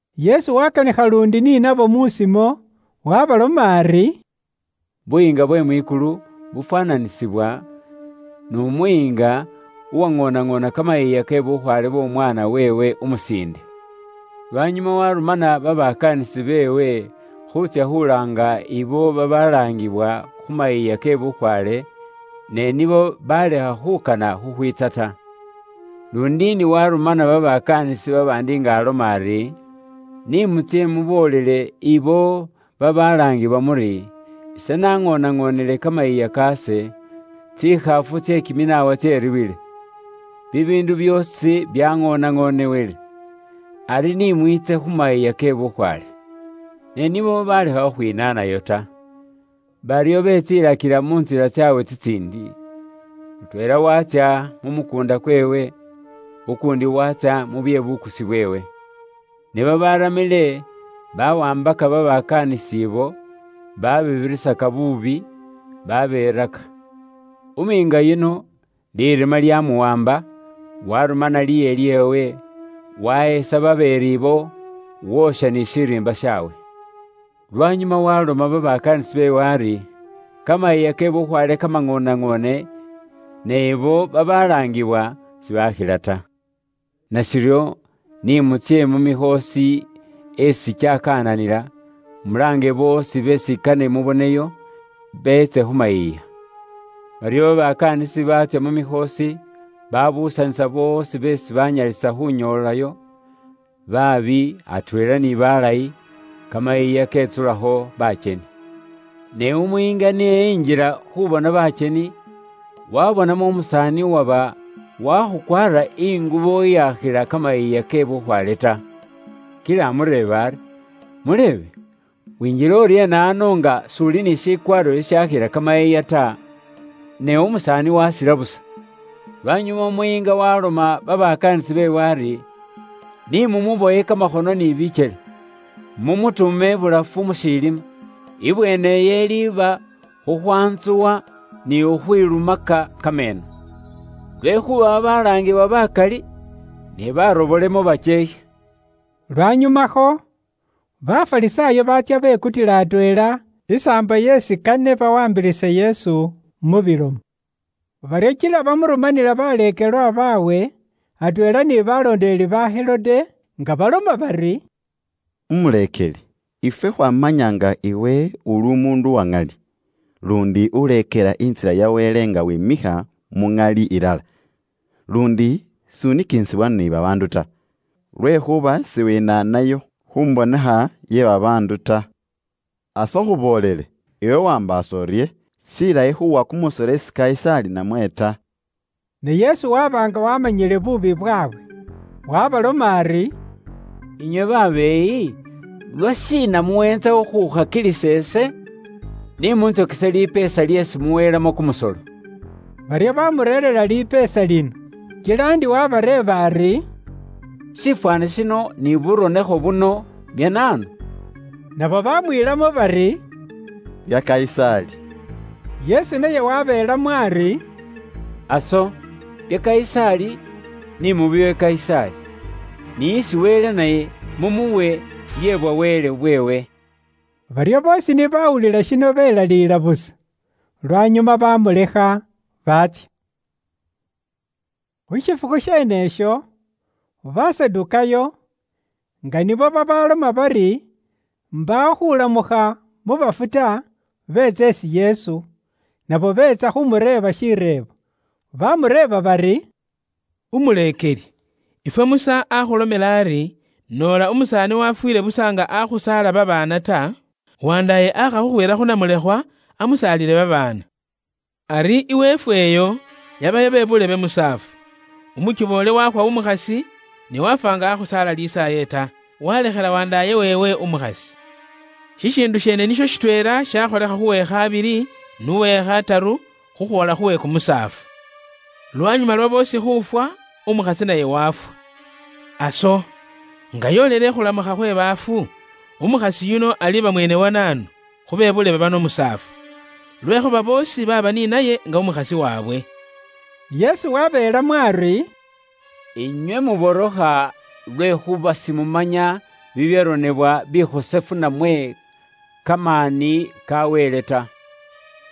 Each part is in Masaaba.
Yesu waakanikha luundi ni nabo musimo, waabaloma ari, “Buyiinga bwe mwikulu bufwaananisibwa n'umuyiinga uwaŋoonaŋoona kamayiiya ke bukhwaale bw'omwaana weewe umusiinde. Lwanyuma waarumana babakaanisi beewe khuutsya khulaanga ibo babalaangiwa khu mayiiya ke bukhwaale, ne nibo baleakha khukana khukhwiitsa ta. Luundi ndi waarumana babakaanisi babaandi nga aloma ari, ‘Ni mutsye muboolele abo babalaangiwa muri, ise naŋoonaŋoonele kamayiiya kaase, tsikhaafu tse kiminaawa tseriiwile. Bibiindu byoosi byaŋoonaŋoonewele. Ari ni mwiitse khu mayiiya ke bukhwaale.’ Ne nibo balekha khukhwinaanayo ta, baryo betsiilakila mu ntsila tsaabwe tsitsiindi: mutweela waatsya mu mukuunda kweewe, ukuundi waatsya mu bye bukusi bweewe. Ne babaaramile bawaambaka babakaanisi abo baababirisaka buubi, babeeraka. Umuyiinga yuno lirima lyamuwaamba, warumana liiye lyeewe, wahesaka babeeri ibo, woosha ni shiriimba shaawe. “Lwanyuma waloma babakaanisi beewe ari, ‘Kamayiiya ke bukhwaale kamaŋoonaŋoone, ne ibo babalaangiwa sibaakhila ta. Nashiryo, ni mutsye mu mikhoosi esi kyakananila, mulaange boosi beesi kane muboneyo, beetse khu mayiiya.’ Baryo babakaanisi baatsya mu mikhoosi, baabuusanisa boosi beesi baanyalisa khuunyoolayo, baabi atweela ni baalayi, litiilo lye kamayiiya lyetsulamo bakyeni. “Ne umuyiinga ni enjila khuubona bakyeni, waabonamo umusaani uwaba waakhukwaara ingubo iyaakhila kamayiiya ke bukhwaale ta. Kila amureeba ari, ‘Mulebe, winjiile uryeena ano nga s'uli ni shikwaaro shishaakhila kamayiiya ta?’ Ne umusaani waasila busa. Lwanyuma umuyiinga waaloma babakaanisi beewe ari, ‘Ni mumubowe kamakhono ni bikyele, mumutuume ibulafu mu shilima. Ibweene iyo iliiba khukhwaantsuwa ni khukhwilumaka kameeno.’ Lwekhuuba babalaangibwa bakali, ne baarobolemo bakyeekhe.” Lwanyumakho, Bafarisaayo baatsya bekutila atweela isaambo yeesi kane bawaambilise Yesu mu bilomo. Baryo kila bamurumanila baleekelwa baabwe atweela ni baloondeleli ba Herode, nga baloma bari, “Umuleekeli, ifwe khwamanya nga iwe uli umuundu uwa ŋali, luundi uleekela intsila ya Wele nga wimikha mu muŋali ilala, luundi s'unikinisibwa ni babaandu ta, lwekhuuba siwinaanayo khu mbonekha ye babaandu ta. Aso khuboolele, iwe waambaasa urye? Shilayi khuuwa kumusolo isi Kayisaali namwe ta?” Ne Yesu waba nga waamanyile buubi bwaabwe, waabaloma ari, “Inywe babeeyi, lwashiina muweentsa khukhukhakilisa ise? Ni muntsokese lipeesa lyeesi muweelamo kumusolo.” Baryo bamureerera idinari. Kila ndi wabareeba ari, “Shifwaani shino, ni buronekho buno, bya naanu?” Nabo bamwiilamo bari, “Bya Kayisaali.” Yesu naye wabeelamo ari, “Aso, bya Kayisaali, ni mubiwe Kayisaali, ni isi Wele naye mumuwe bye bwa Wele bweewe.” Baryo boosi ni bawulila shino belaliila busa. Lwanyuma bamulekha, baatsya. Khu shifukhu sheene isho, Basadukaayo, nga nibo babaloma bari mbaawo khulamukha mu bafu ta, beetsa isi Yesu. Nabo beetsa khumureeba shireebo. Bamureeba bari, “Umuleekeli, ifwe Musa akhulomela ari, ‘Noola umusaani wafwiile busa nga akhusaala babaana ta, wandaaye aakha khukhwiila khu namulekhwa, amusaalile babaana.’ Ari iweefwe iyo, yabayo be buulebe musaafu. Umukiboole wakhwa umukhasi, ne wafwa nga akhusaala lisaaye ta, walekhela wandaaye weewe umukhasi. Shishiindu sheene nisho shitweela shakholekha khuwe khabili, n'uwe khataru, khukhwoola khuwe kumusaafu. Lwanyuma lwa boosi khuufwa, umukhasi naye wafwa. Aso, nga yoolele ikhulamukha khwe baafu, umukhasi yuno aliiba mweene wa naanu, khu be buulebe bano musaafu? Lwekhuuba boosi baaba ni naye nga umukhasi waabwe.” Yesu wabeelamo ari, “Inywe muborokha lwekhuuba simumanya bibyaronebwa bikhosefu namwe kamaani ka Wele ta.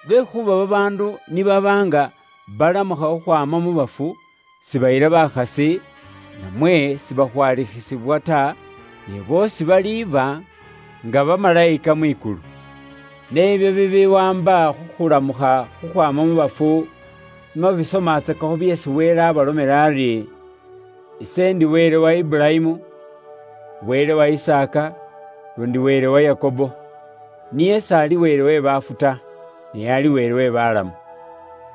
Lwekhuuba babaandu ni baba nga balamukha khukhwaama mu bafu, sibayila bakhasi, namwe sibakhwalikhisibwa ta, ne boosi baliiba nga bamalayika mwikulu. Ne ibyo bibiwaamba khu khulamukha khukhwaama mu bafu, simwasomatsakakho byeesi Wele abalomela ari, ‘Ise ndi Wele wa Iburayimu, Wele wa Isaaka, luundi Wele wa Yakobo?’ Niye s'ali Wele we baafu ta, ne ali Wele we balamu.”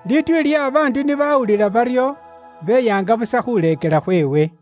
Lituuli lye babaandu ni bawulila baryo, beyaanga busa khuleekela khweewe.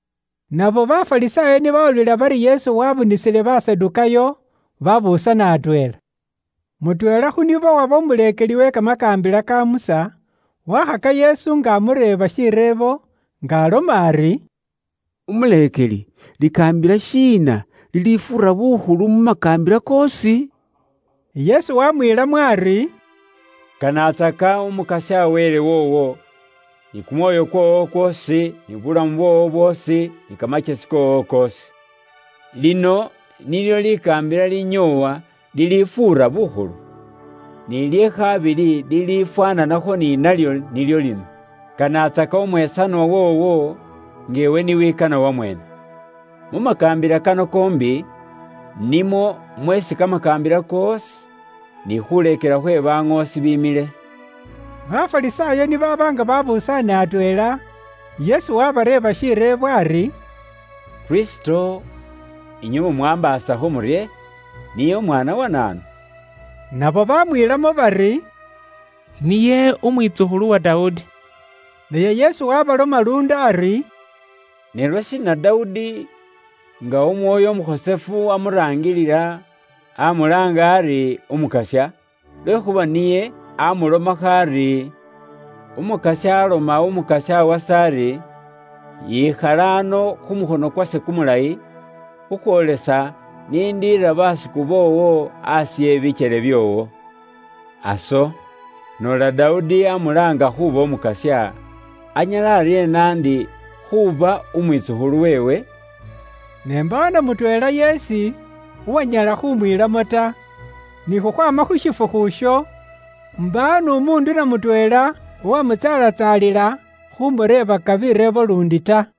Nabo Bafarisaayo ni bawulila bari Yesu wabunisile Basadukaayo, babuusana atweela. Mutweela khu nibo uwaba umuleekeli we kamakaambila ka Musa, waakhaka Yesu nga amureeba shireebo, nga aloma ari: “Umuleekeli, likaambila shiina lilifuura bukhulu mu makaambila koosi?” Yesu waamwiilamo ari, “Kanatsaka Umukasya Wele woowo, ni kumwoyo kwoowo kwoosi, ni bulamu bwoowo bwoosi, ni kamakyesi koowo koosi. Lino nilyo likaambila linyoowa lilifuura bukhulu. Ni lye khabili lilifwaananakho ni nalyo nilyo lino: kanatsaka umwesanwa woowo, nga iwe ni wikana wamweene. Mu makaambila kano koombi, nimwo mweesi kamakaambila koosi, ni khuleekela khwe baŋoosi bimile.” Bafarisaayo ni baaba nga baabusaane atweela, Yesu wabareeba shireebo ari, “Kristo, inywe mumwaambaasakho murye? Niye Umwaana wa naanu?” Nabo bamwiilamo bari, “Niye Umwitsukhulu wa Dawudi.” Naye Yesu waabaloma luundi ari, “Ne lwashiina Dawudi, nga Umwoyo Umukhosefu amuraangilila, amulaanga ari, ‘Umukasya?’ Lwekhuuba niye amulomakho ari, ‘Umukasya aaloma Umukasya wase ari: Yikhala ano khu mukhono kwase kumulayi, khukhwoolesa ise n'ikhaare basiku boowo asi we bikyele byoowo.’ “Aso, noola Dawudi amulaanga khuuba ‘Umukasya,’ anyala aryeena ndi khuuba umwitsukhulu weewe?” Ne mbaawo na mutweela yeesi uwanyala khumwiilamo ta, ni khukhwaama khu shifukhu isho, mbaawo n'umuundu na mutweela uwamutsaalatsaalila khumureebaka bireebo luundi ta.